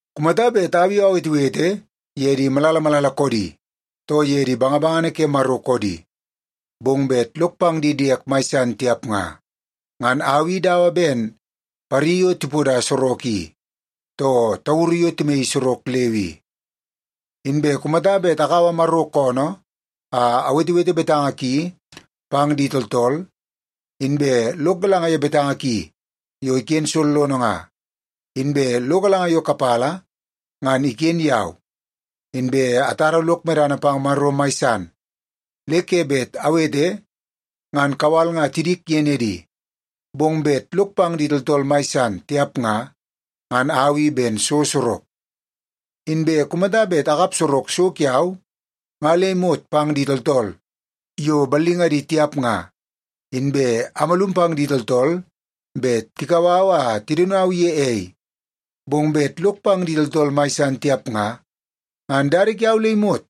Kumata bet au i awetewete ye di malala malala koodi, too ye di bangabangana ke Maro koodi, bong bet lok pang di diek mai san tiap nga, ngan au i dawa ben pari yo tipoda sorok i, too tauru yo timaii sorok leu i. Inbe kumata bet akaua Maro koonoo a awetewete betanga ki pang di tooltool, inbe lok galanga ye betanga ki yo iken sollono nga, inbe lo galanga yo kapala ngan iken yau, inbe atara lok medana pang Maro mai san le ke bet awete ngan kawal nga tidik ye nedi, bong bet lok pang di tooltool mai san tiap nga, ngan au i ben so sorok. Inbe kumata bet akap sorok so kiau nga le imot pang di tooltool yo ballingadi tiap nga, inbe amalum pang di tooltool bet tikau au a tidaun au ye ei, bong bet lok pang di tooltool mai san tiap nga, ngan dada kiau le imot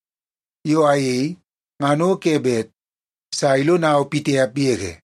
yo ayei ngan o ke bet sa ilonau pitiap yege.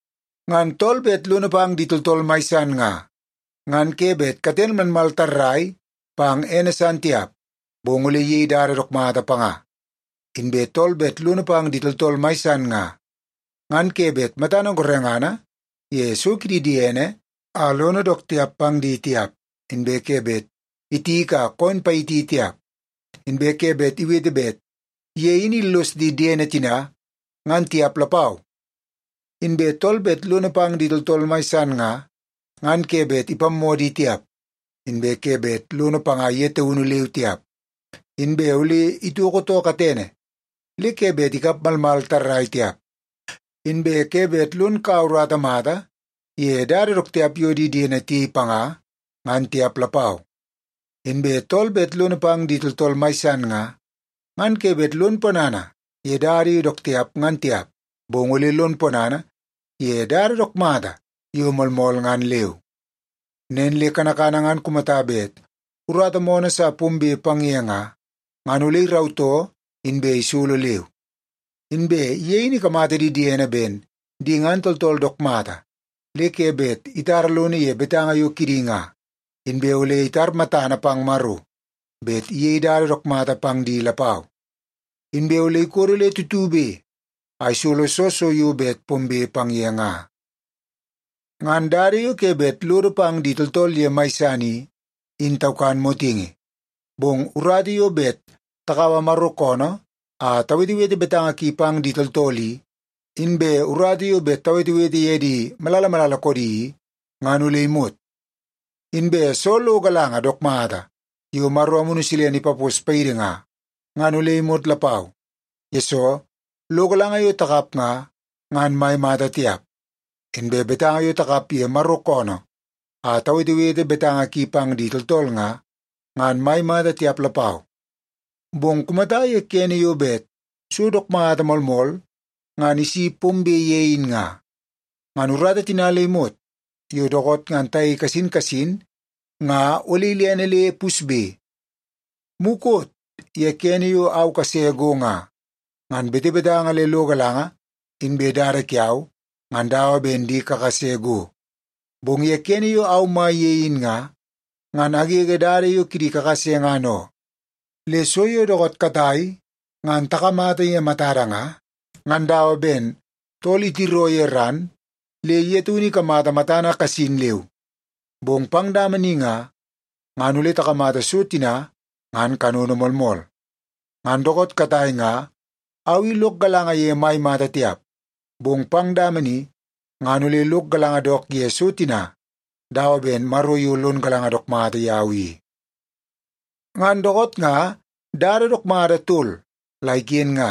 Ngan tool bet lono pang di tooltool mai san nga, ngan ke bet katene malmal tarrai pang ene san tiap, bong ole iyei dada dook mata panga. Inbe tool bet lono pang di tooltool mai san nga, ngan ke bet matana gorengana ye so kidi diene a lono dook tiap pang di tiap, inbe ke bet itiki a koon payiti tiap, inbe ke bet iwete bet ye in illos di diene tina, ngan tiap lapau. Inbe tool bet lono pang di tooltool mai san nga, ngan ke bet ipammoo di tiap, inbe ke bet lono panga ye taunu leu tiap, inbe ole itoko too katene le ke bet ikap malmal tarrai tiap, inbe ke bet lon kaua urata mata ye dada dook tiap yo di diene tiyei panga, ngan tiap lapau. Inbe tool bet lono pang di tooltool mai san nga, ngan ke bet lon ponana ye dada yo dook tiap ngan tiap, bong ole lon ponana ye dada dook mata yo moolmool ngan leu. Nen le kanakana ngan kumata bet urata moonoo sa pombe pang ye nga, ngan ole irautoo inbe isolo leu. Inbe ye in ikamata di diene ben di ngan tooltool dook mata le ke bet itara lono ye betanga yo kidi nga, inbe ole itar matana pang Maro bet iyei dada dook mata pang di lapau. Inbe ole ikodo le tutube a isolo soo so yo bet pombe pang ye nga. Ngan dada yo ke bet lodo pang di tooltool ye mai san i, in taukan motingi. Bong urata yo bet takaua Maro koonoo a tawetewete betanga ki pang di tooltool i, inbe urata yo bet tawetewete ye di malala malala koodi i, ngan ole imot. Inbe soo lo galanga dook mata yo Maro Amunu Silene ipapos paidi nga, ngan ole imot lapau. Yesoo, lo galanga yo takap nga, ngan mai mata tiap. Inbe betanga yo takap ye Maro koonoo a tawetewete betanga ki pang di tooltool nga, ngan mai mata tiap lapau. Bong kumata ye kene yo bet so dook mata moolmool ngan isi pombe ye in nga, ngan urata tina le imot yo dookoot ngan tayei kasin kasin nga ole ilene le pusbe. Mukot ye kene yo au kase go nga, ngan betebetanga le lo galanga inbe dada kiau ngan dawa ben di kakase go. Bong ye kene yo au mai ye in nga, ngan agege dada yo kidi kakase ngan oo. Le so yo dookoot katai ngan takamata ye matada nga, ngan dawa ben tool itiroo ye ran le ye taunu ikamata matana kasin leu. Bong pang dama ni nga, ngan ole takamata so tina ngan kanono moolmool. Ngan dookoot katai nga au i lok galanga ye mai mata tiap, bong pang dama ni ngan ole lok galanga dook ye so tina dawa ben Maro yo lon galanga dook mata yau i. Ngan dookoot nga dada dook mata tol la iken nga;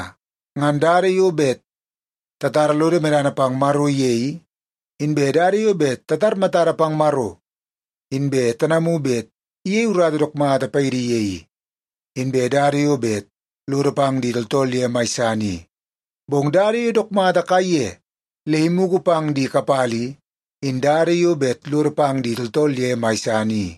ngan dada yo bet tatara lodo medana pang Maro ye i, inbe dada yo bet tatar matada pang Maro inbe tanamu bet iyei urata dook mata paidi ye i, inbe dada yo bet lodo pang di tooltool ye mai san i. Bong dada yo dook mata kaiye le imugu pang di kapala i, in dada yo bet lodo pang di tooltool ye mai san i.